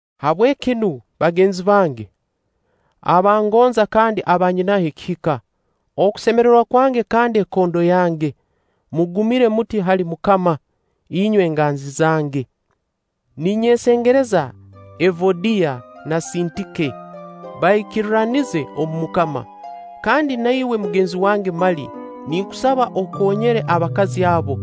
Habweki nu, bagenzi bange, aba ngonza kandi aba nyinaho ekihika, okusemererwa kwange kandi ekondo yange, mugumire muti hali MUKAMA, inywe enganzi zange. Ninyesengereza Evodiya na Sintike, baikirranize omu MUKAMA. Kandi na iwe mugenzi wange mali, ninkusaba okoonyere abakazi abo,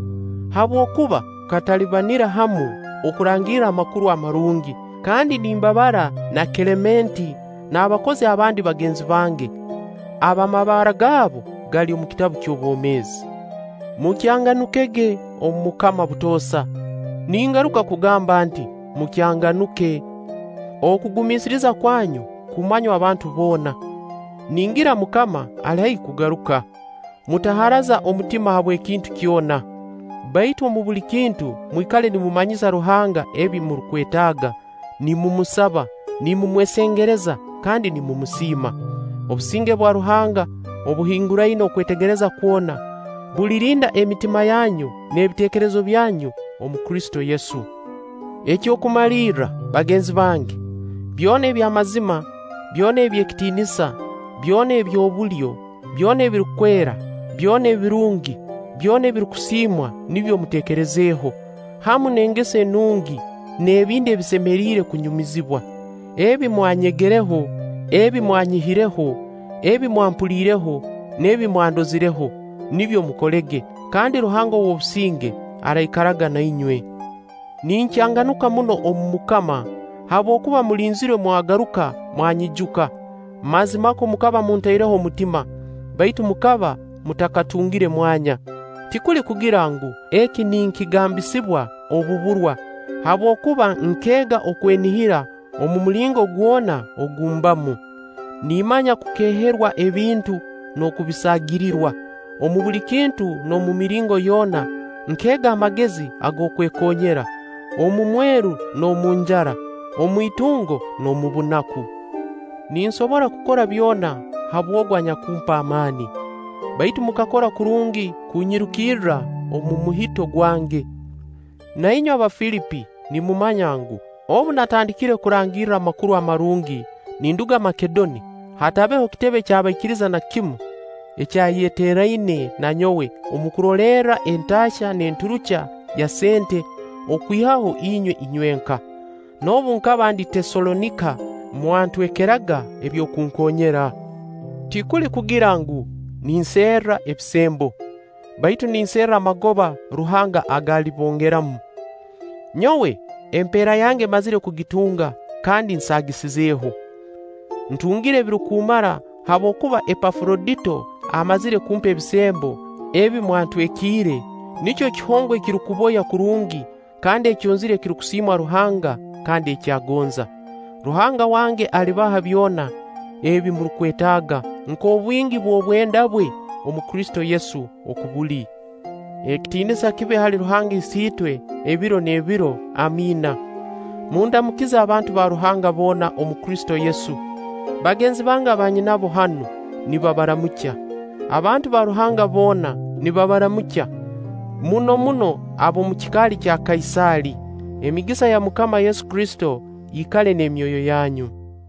habwokuba tukatalibanira hamu okurangirra Amakuru Amarungi, kandi nimbabara na Kelementi n'abakozi abandi bagenzi bange ab'amabara gaabu gali omu kitabu eky'obomeezi. Mukyanganukege omu MUKAMA obutoosa; ningaruka kugamba nti: Mukyanganuke. Okugumiisiriza kwanyu kumanywe abantu boona. Ningira MUKAMA ali haihi kugaruka. Mutaharaza omutima habw'ekintu kyona, baitu omu buli kintu mwikale nimumanyisa Ruhanga ebi murukwetaaga, nimumusaba, nimumwesengereza kandi nimumusiima. Obusinge bwa Ruhanga obuhinguraine okwetegereza kwona, bulirinda emitima yanyu n'ebiteekerezo byanyu omu Kristo Yesu. Eky'okumalirra, bagenzi bange, byona eby'amazima, byona eby'ekitiinisa, byona eby'obulyo, byona ebirukwera, byona ebirungi, byona ebirukusiimwa nibyo muteekerezeho, hamu n'engeso enungi n'ebindi ebisemeriire kunyumizibwa. Ebi mwanyegereho, ebi mwanyihireho, ebi mwampuliireho, n'ebi mwandozireho, nibyo mukolege; kandi Ruhanga ow'obusinge araikaraga na inywe. Ninkyanganuka muno omu MUKAMA, habwokuba mulinzirwe mwagaruka mwanyijuka. Mazimakwo mukaba muntaireho omutima, baitu mukaba mutakatungire mwanya. Tikuli kugira ngu, eki ninkigambisibwa obuburwa, habwokuba nkeega okwenihira omu mulingo gwona ogu mbamu. Nimmanya kukeeherwa ebintu n'okubisaagirirwa; omu buli kintu n'omu miringo yoona nkeega amagezi ag'okwekoonyera: omu mweru n'omu njara, omu itungo n'omu bunaku. Ninsobora kukora byona habw'Ogu anyakumpa amaani. Baitu mukakora kurungi kunyirukirra omu muhito gwange. Na inywe Abafilipi nimumanya ngu, obu natandikire kurangirra Amakuru Amarungi ninduga Makedoni, hatabeho kitebe ky'abaikiriza na kimu ekyayeteeraine na nyowe omu kurolerra entaahya n'enturukya ya sente, okwihaho inywe inywenka. Noobu nkaba ndi Teesalonika, mwantwekerega eby'okunkoonyera. Tikuli kugira ngu, ninserra ebisembo; baitu ninserra amagoba Ruhanga aga alibongeramu. Nyowe, emperra yange mmazire kugitunga kandi nsaagisizeho! Ntungire ebirukumara habwokuba Epafurodito amazire kumpa ebisembo ebi mwantwekiire, nikyo kihongwa ekirukuboya kurungi kandi ekyonzira ekirukusiimwa Ruhanga kandi eki agonza. Ruhanga wange alibaha byona ebi murukwetaaga nk'obwingi bw'obwenda bwe omu Kristo Yesu oku buli. Ekitiinisa kibe hali Ruhanga Isiitwe ebiro n'ebiro. Amiina. Mundamukize abantu ba Ruhanga boona omu Kristo Yesu. Bagenzi bange aba nyinabo hanu, nibabaramukya. Abantu ba Ruhanga boona nibabaramukya, muno muno ab'omu kikaali kya Kaisaali. Emigisa ya MUKAMA Yesu Kristo ikale n'emyoyo yanyu.